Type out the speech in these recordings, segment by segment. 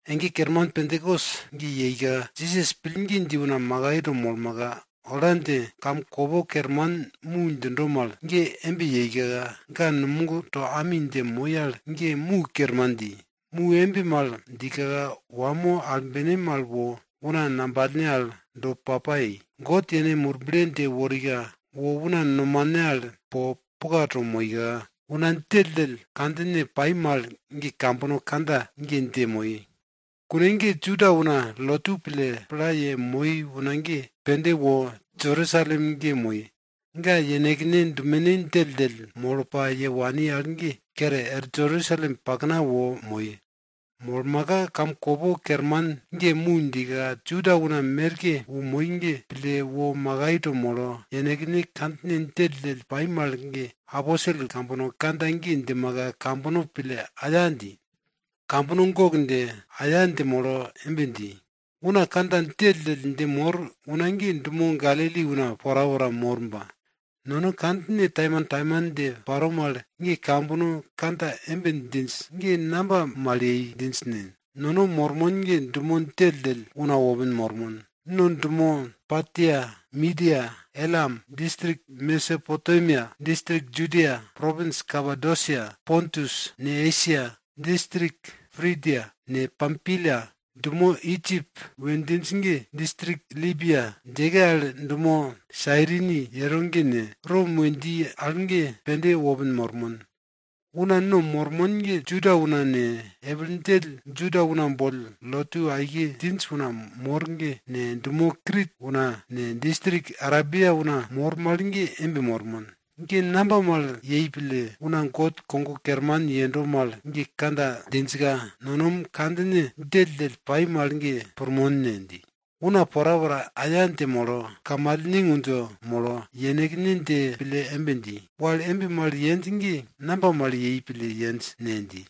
Ege kerman Pentakos ge yeika, Jisas pillgi dji una makai to molmaka, ola dje kamkopo kerman mu djindo mal ge embe djika, ga numogto ami dje moi al ge mu kermanke dji. Mu embe mal djika, wamo albene mal wo una ngambalne al do papa yei. God yene Murble dje worika, wo una nomane al po puka to moika, una djelldjell kandjine pai mal ge kambono kandja ge dje moi. Kune ge Juda una lotu pille pla yemoi una pende wo Jerusalem ge moi. Ga yenekne dumene djelldjell molo pa ye wani al ge kere er Jerusalem pakna wo moi. Molmaka kamkopo kerman ge mu djika, Juda una merke wo moi ge, pille wo makai to molo, yenekne kandjine djelldjell pai mal ge aposel kambono kandja ge djimaka, kambono pille aya dji. Kambono gok dje, aya dje molo embe dji, una kandjine djelldjell dje mor una ge, dumo Galili una porapora mor ba, no kandjine taimantaiman dje paro mal ge kambono kandja embe djinj ge, namba mal yei pille djinj ne? No mormon ge dumo djelldjell una wopin mormon. No dumo Partia, Midia, Elam, distrik Mesopotemia, distrik Judia, propins Kapodosia, Pontus ne, Esia, distrik Prigia ne, Pampilia, dumo Idjip we djinj ge, distrik Libia djeke al dumo Sairini yero ge ne, Rom we dji al ge pende wopin mormon. Una no mormon ge, Juda una ne, epil djell Juda una boll lotu aike djinj una mor ge ne, dumo Krit una ne, distrik Arebia una mor mal ge embe mormon. Ge namba mal yei pille una God kogo kerman yendo mal ge kandja djinjka, no kandjine djelldjell pai mal ge pirmon ne? dji. Una porapora aya dje molo, kamalne ngundjo molo, yenekne dje pille embe dji, wal embe mal yenj ge namba mal yei pille yenj ne? dji.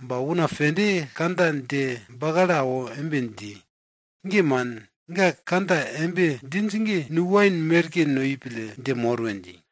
Ba una pende kandja dje bakalo awo embe dji, ge man, ga kandja embe djinj ge, nu wain merke noi pille dje mor we dji.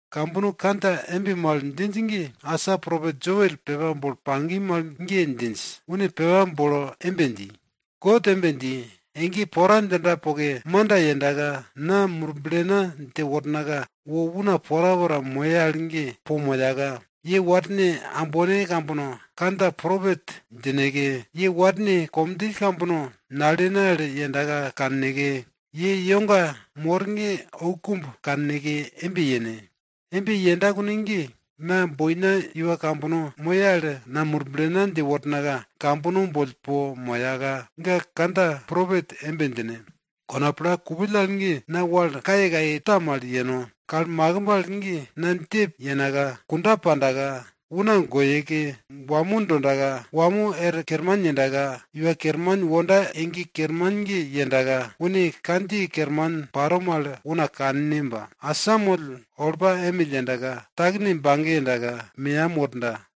Kambono kandja embe mal djinj ge, asa propet Joel pepa bolo pagi mal ge djinj. Une pepa bolo embe dji, God embe dji, ege pora djinda poke manda yendaka, na Murblena dje wornaka, wo una porapora moye al ge po moyaka, ye warne ambone kambono kandja propet djineke, ye warne komdjill kambono nalene al yenda kanneke, ye iwoga mor ge oukumb kanneke embe yene. Embe yenda kune ge, na boina iwana kambono moye al, na Murblena dje wornaka kambono boll po moyaka, ga kandja propet embe djine. Kona pla kupill al ge, na wal kayekaye ta mal yeno. Kal makimb al ge na djep yenaka, kunda pandaka, una goyeke, wamo dondaka wamo er kerman yendaka, Iwa Kerman wonda ege kerman ge yendaka, une kandjiye kerman paro mal una kanne ba, asamoll olpa emill yendaka, takene bage yendaka, meyam worda.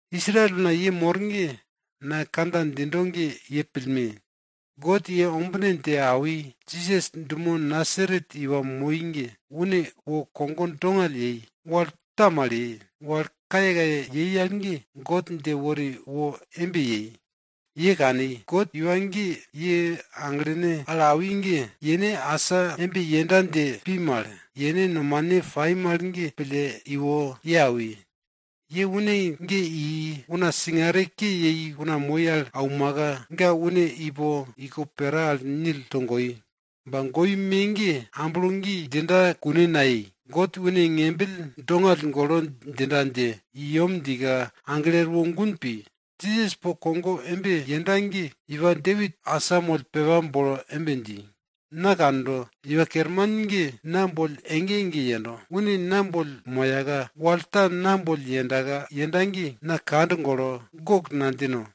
Israel una ye mor ge, na kandja djindo ge ye pillme! God ye ombine dje awi, Jisas dumo Nasaret iwa moi ge, une wo kogo dongall ye, wal ta mal ye, wal kayekaye yei al ge, God dje wori wo embe yei, ye kani. God iwa ge ye aglene al awi ge, yene asa embe yenda dje pi mal, yene nomane pai mal ge pille iwo ye awi. Ye une ge i, una singare ke yei una moi al aumaka, ga une ipo iko pera al nil togoi. Ba goi me ge amblo gi djinda kune nayei, God une ngembill dongall golo djinda dje i yem djika, aglo erwo gun pi. Jisas po kogo embe yenda ge, iwa Depit asamoll pepa bolo embe dji, Na kando, Iwa Kerman ge na boll ege ege yendo. Une na boll moyaka, wal ta na boll yenda ge, na kand golo, gok nadjino.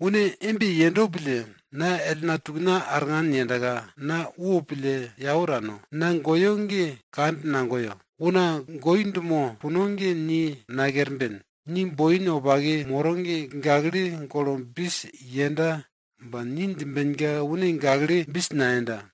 Une embe yendo pille, na ellna tukna arngan yendaka, na wopille yau tano, na goyo ge kand nagoyo. Una goi dumo puno ge ni nakerben, ni boin wopake moro ge gakle golo bis yenda ba ni djimbenka, une gakle bis nayenda.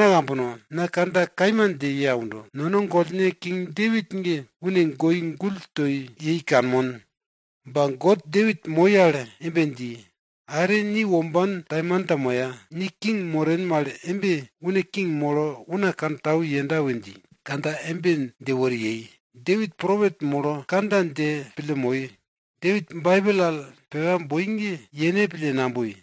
Agana ambana kambono, na kandja kaima dje ye aundo. Nono gollne King Depit ge une goi gull toi yei kanmon. Ba God Depit moi al embe dji, are ni womban taimanta moya ni king moren mal embe une king molo una kantau yenda we dje kandja embe dje wori yei, Depit propet molo kandja ge pille moi. Depit Baibel al pepa boi ge, yene pille naboi.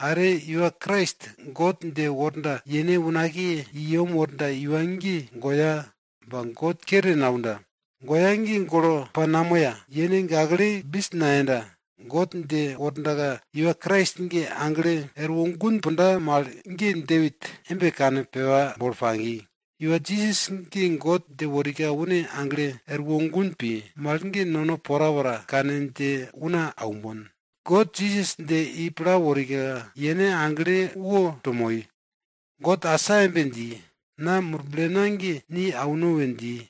Are Iwa Krais God dje worda yene unakiye i yem worda iwa ge goya ba God kere naunda. Goya ge golo pa namoya yene gakle bis nayenda. God dje worda iwa Krais ge aglo erwo gun punda mal ge Depit embe kane pepa bolo pagi. Iwa Jisas ge God dje worika une aglo erwo gun pi mal ge no porapora kane dje una aunmon. God Jisas dje i pla worika, yene agle woto moi. God asa embe dji, na Murblena ge ni auno we dji.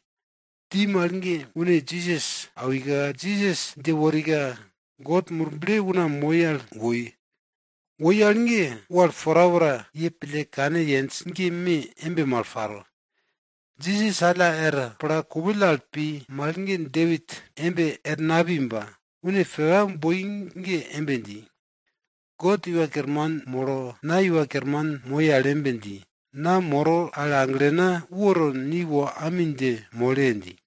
Dji mal ge une Jisas awika, Jisas dje worika, God Murble una moi al woi. Woi al ge, wal porapora ye pille kane yenj ge me embe mal paro. Jisas alla er pla kupill al pi mal ge Depit embe er napi ba, une pepa boi ge embe dji, God Iwa Kerman molo na iwa kerman moi al embe dji, na moro al aglena woto ni wo ami dje mole! dji.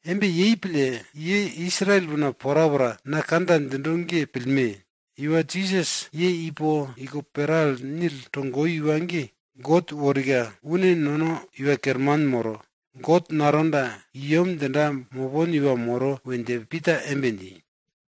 Embe yei pille ye Israel una porapora na kandja djindo ge pillme! Iwa Jisas ye ipo iko pera al nil togoi iwa ge, God yeworika, une nono i yem djinda mopon Iwa Kerman moro we dje Pita embe dji.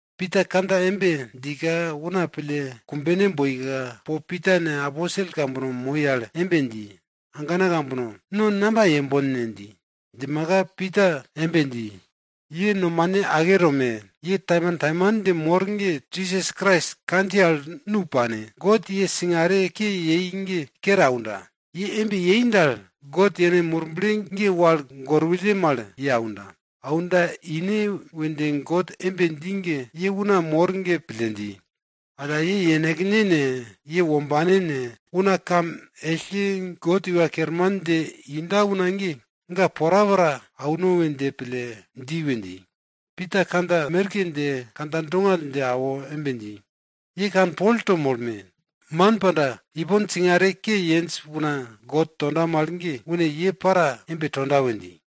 Pita kandja embe djika, una pille kumbene boika, po Pita ne, aposel kambono moi al embe dji, agana kambono! No namba yembon ne? dji. Djimaka Pita embe dji, ye nomane ake tome! Ye taimantaiman dje mor ge Jisas Krais kandjiye al nu paneke, God ye singare ke yei ge kere aunda. Ye embe yei dal, God yene Murble ge wal gorwulle mal ye aunda. Aunda ine we dje God embe dji ge, ye una mor ge pille dji. Alla, ye yenekne ne, ye wombane ne, una kam ellke God Iwa Kerman dje inda una ge, ga porapora auno we dje pille dji we dji. Pita kandja merke dje kandja dongall dje awo embe dji, ye kanpol to molme! Man panda, ipon singare ke yenj una God tonda mal ge, une ye para embe tonda we dji.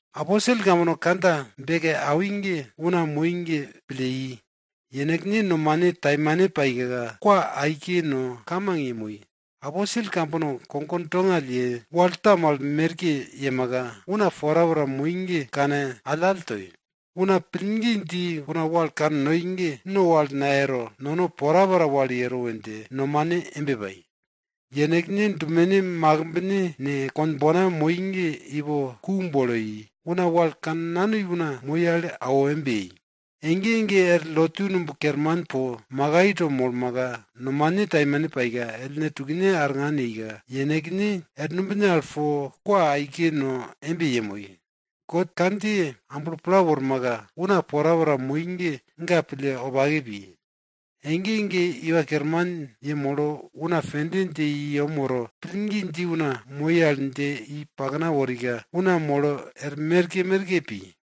Aposel kambono kandja beke awi ge, una moi ge pille i. Yenekne nomane taimane paika, kwa aike no, kamang yemoi. Aposel kambono kogo dongall ye, wal ta mal merke yemaka, una porapora moi ge kane allall toi. Una pillgi dji una wal kannoi ge no wal nayero, nono porapora wal yero we dje nomane embe pai. Yenekne dumene makimbne ne, konbona moi ge ipo ku bolo i. Una wal kannanoi una moi al awo embe yei. Ege ege er lotu numb kerman po makai to molmaka, nomane taimane paika, ellne tukne arngan yeika, yenekne er numbine al po kwa aike no embe yemoi. God kandjiye amblo pla wormaka, una porapora moi ge, ga pille wopake pi. Ege ege Iwa Kerman yemolo una pende dje i yem woro, pillgi dji una moi al dje i pakna worika, una molo er merke merke pi.